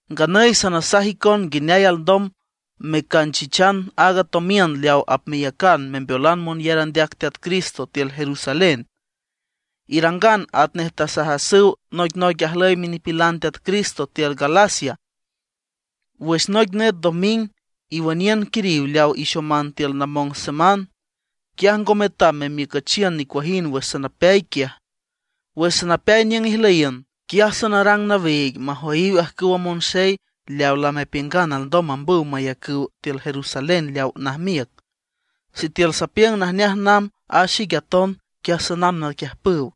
Nganüy sanasaj icon nguineay alndom mecanchichan aaga tomiün leaw apmeyacan membeolan monyar andeac Teat Cristo tiül Jerusalén. Irangan atnej tasajasüw noicnoic ajlüy minipilan Teat Cristo tiül Galacia. Wüx noic nüt doming iwüniün quiriw leaw ixoman tiül namong seman; quiaj ngo metam memiücüchiün nicuajind wüx sanapeay quiaj. Wüx sanapeay niüng ijlüyiün, quiaj sanarang nawiig majoyiw ajcüwa monxey leaw lamepiüngan alndom mambüw mayacüw tiül Jerusalén leaw najmiüc. Sitiül sapiüng najneaj namb a xique aton, quiaj sanamb naquiüjpüw.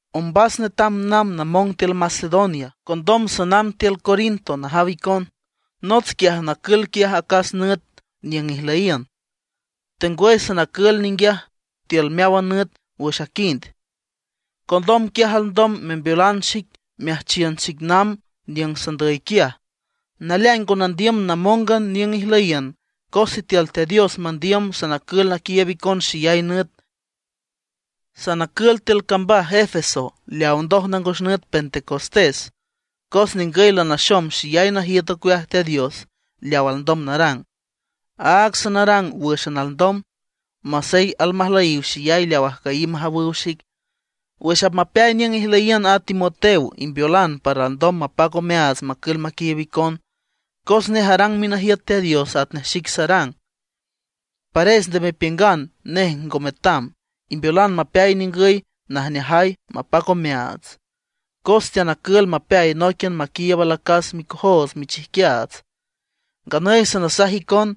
Ombas netam namb namong tiül Macedonia, condom sanamb tiül Corinto najaw icon. Nots quiaj nacül acas nüt niüng ijlüyiün, tengwüy sanacül ninguiaj tiül meáwan nüt wüx aquind. Condom quiaj alndom membeolan xic meajchiün xic namb niüng sanandüy quiaj. Naleaing ngo nandiüm namóngan niüng ijlüyiün, cos sitiül Teat Dios mandiüm, sanacül naquiiüb icon xeyay nüt. Sanacül tiül cambaj Efeso leaw ndoj nangos nüt Pentecostés. Cos ningüy lanaxom xeyay najiüt ocueaj Teat Dios leaw alndom narang; áag sanarang wǘxan alndom, masey almajlüyiw xeyay leaw ajcüyiw majawüw xic. Wüx apmapeay niüng ijlüyiün a Timoteo, imbeolan para alndom mapac omeaats macül maquiiüb icon, cos nej arang minajiüt Teat Dios atnej xique sarang. Pares nde mepiüngan nej ngo metam, imbeolan mapeay ningüy najneajay mapac omeaats, cos teanacül mapeay nóiquian maquiiüb alacas micojoots michijquiaats. Nganüy sanasaj icon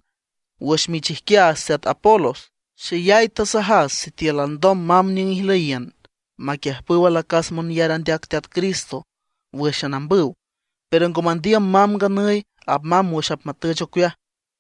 wüx michijquiaats teat Apolos. Xeyay tasajas sitiül alndom mamb niüng ijlüyiün maquiüjpüw alacas monyar andeac Teat Cristo wǘxan ambüw. Pero ngo mandiüm mamb nganüy; apmamb wüx apmatüch ocueaj.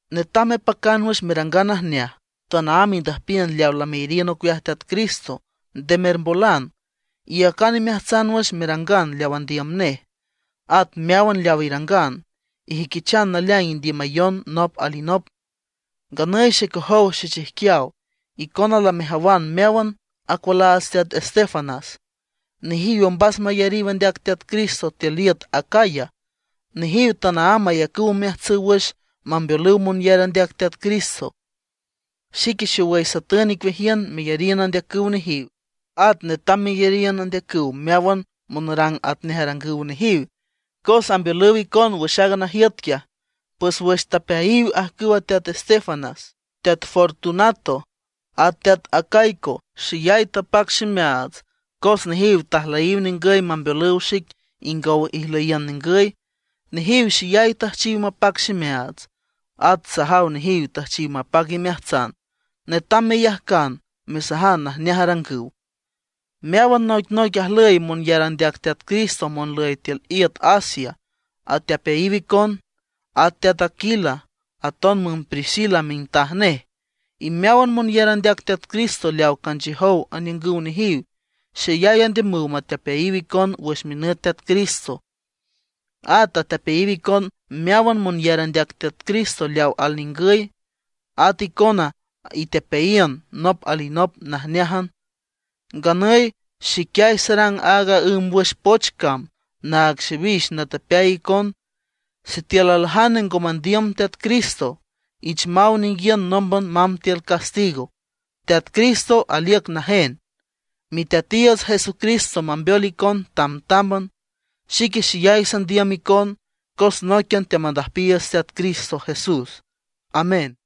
Netam mepacan wüx merangan najneaj; tanaámb indüjpiün leaw lameyariün ocueaj Teat Cristo, nde mermbolan, iyacan imeajtsan wüx merangan leaw andiüm nej. At meáwan leaw irangan, ijüiquichan naleaing indiümayon nop alinop. Nganüy xecojow xechijquiaw, icona lamejawan meáwan acualaats teat Estéfanas, nejiw ombas mayariw andeac Teat Cristo tiül iüt Acaya. Nejiw tanaámb ayacüw omeajtsüw wüx mambeolüw monyar andeac Teat Cristo. Xique xowüy satün icueajiün meyariün andeacüw nejiw, at netam meyariün andeacüw meáwan monarang atnej arangüw nejiw, cos ambeolüw icon wüx aaga najiüt quiaj. Pues wüx tapeayiw ajcüw teat Estéfanas, teat Fortunato, at teat Acaico, xeyay tapac ximeaats, cos nejiw tajlüyiw ningüy mambeolüw xic ingow ijlüyiün ningüy. Nejiw xeyay tüjchiw mapac ximeaats, at sajaw nejiw tüjchiw mapac imeajtsan. Netam meyajcan mesajan najneaj arangüw. Meáwan noicnoic ajlüy monyar andeac Teat Cristo monlüy tiül iüt Asia atepeayiw icon. At teat Aquila, aton müm Priscila mintaj nej, y meáwan monyar andeac Teat Cristo leaw canchiüjow aniüngüw nejiw, xeyay andiümüw matepeayiw icon wüx minüt Teat Cristo. At atepeayiw icon meáwan monyar andeac Teat Cristo leaw alningüy. At icona itepeayiün nop alinop najneájan. Nganüy xiquiay sarang aaga ǘmbwüx poch cam naag xiwix natepeay icon. Sitiül aljane ngo mandiüm Teat Cristo, ich maw ninguiün nómban mamb tiül castigo. ¡Teat Cristo aliüc najen! Miteatiiüts Jesucristo mambeol icon tamtámban. Xique xeyay sandiüm icon, cos nóiquian teamandüjpiiüts Teat Cristo Jesús. Amén.